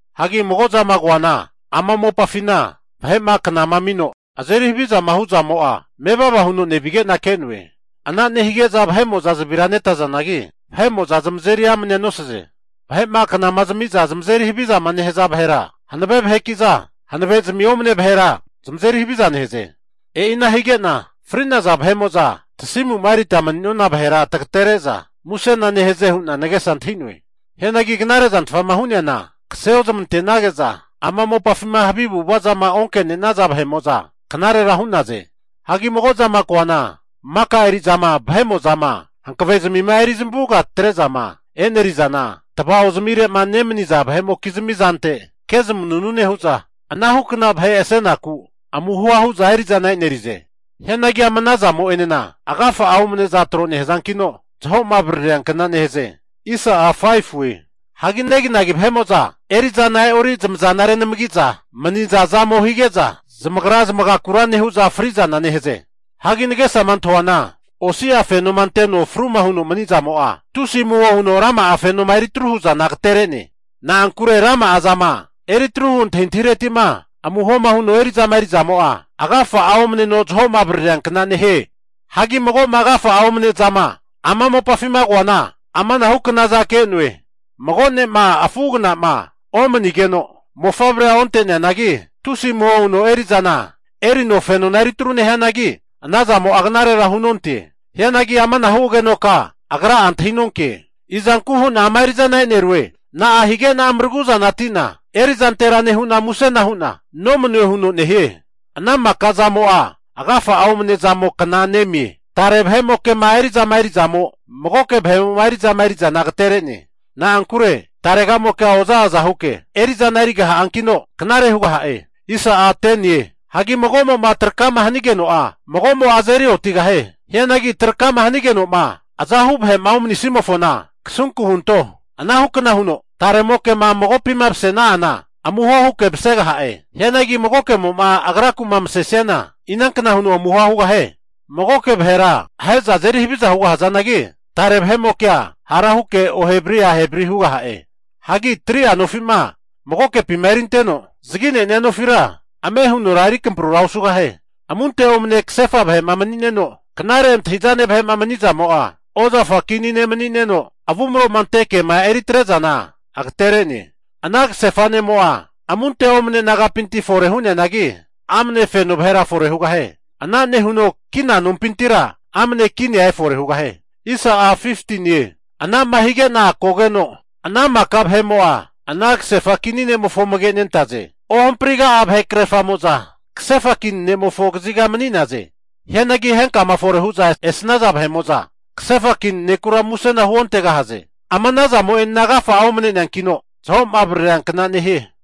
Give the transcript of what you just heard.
Hagi mago zama koana, ama mopafina vahe'ma knama amino azeri havizama hu zamo'a mevava huno nevige'na ke'noe. Ana nehige'za vahe'mo'za zavira netazanagi, vahe'mo'za zamazeri amnea nosaze. Vahe'ma knama zamiza zamazeri havizama nehaza vahera hanave vaheki'za, hanavezmi omane vahera zamazeri haviza nehaze. E'ina hige'na fri'naza vahe'mo'za tasimu'ma erita mani'nona vahera tagatere'za musena nehaze hu'na nagesa antahi'noe. Hianagi knare zantfama hu'neana, kaseozmantenage'za ama mopafima havi avu'avazama onke'naza vahe'mo'za knarera hu'naze. Hagi mago'zama koana, maka eri'zama vahe'mo'zama hankavezmima eri zamavuga atre'zama enerizana, tava'ozmire'ma nemaniza vahe'mokizmi zante kezmanunu nehu'za, anahu kna vahe asenaku amuhoa hu'za eri'zana e'nerize. Hianagi ama ana zamo'enena agafa'a omaneza tro nehazankino, zaho'ma avaririankna nehaze. Hagi neginagi vahe'mo'za eri'zana e'ori zamazana renamagiza mani'za zamo hige'za, zamagra zamagakura nehu'za fri'zana nehaze. Hagi nagesama antahuana, osi'a fenoma anteno fruma huno mani'zamo'a, tusi amuho huno rama'a fenoma eritru hu'zana agaterene. Na'ankure rama'a zama eri atruhu antahintahireti'ma amuhoma huno eri'zama eri zamo'a, agafa'a omneno zaho'ma avaririankna nehie. Hagi mago'ma agafa'a omane zama ama mopafima ke'noana ama'nahu knaza ke'noe. Mago ne'ma afu agna'ma omanigeno, mofavre onte'neanagi, tusi amuho huno eri'zana erino fenona eritru nehianagi, ana zamo'a knarera hunonte. Hianagi amanahu agenoka agra'a antahinonke, Izanku hu'na ama eri'zana e'nerue? Na'a hige'na maraguzati'na erizantera nehu'na musena hu'na nomanue huno nehie. Ana maka zamo'a agafa'a omne zamo kna nemie. Tare vahe'mokema eri'zama eri'zamo magoke vahe'mo'ma eri'zama eri'zana agatere'ne. Na'ankure taremokea oza aza huke eri'zana erigaha'ankino, knare hugaha'e. Hagi mago'mo'ma traka'ma hanigeno'a, magomo'a azeri otigahie. Hianagi trakama hanigenoma azahu vahe'ma omani'nimofona kasunku hunto. Anahu kna huno, taremokema magopima masena'ana amuho huke masegaha'e. Hianagi magokemo'ma agraku'ma masesiana inankna huno amuhoa hugahie? Magoke vahera ahe'za azeri haviza hugahazanagi, tare vahe'mokea hara huke ohevari ahevri (oza aza) hugaha'e. Hagi 3'a nofima magokepima erinteno zagi'nenia nofira ame hunora eri akamprura osugahie. Amunte omane kasefa vahe'ma mani'neno, knare antahi'zane vahe'ma mani'zamo'a, ozafa kini ne' mani'neno avumro'ma ante ke'ma eri atre'zana agatere'ne. Ana kasefa ne'mo'a amunte omne nagapinti fore hu'nenianagi, amne feno vahera fore hugahie. Ana nehuno kina nompintira amane kinia efore hugahie. Ana'ma hige'na kogeno ana maka vahe'mo'a ana (nehaza) kasefa kini ne'mofo amage'nentaze. Ohampriga'a vahe krerfamo'za kasefa kini ne'mofo kaziga mani'naze. Hianagi henkama fore hu'za esnaza, kasefa kini nekura musena huontegahaze. Ama ana zamo'enena agafa'a omneneankino, zaho'ma avaririankna nehie.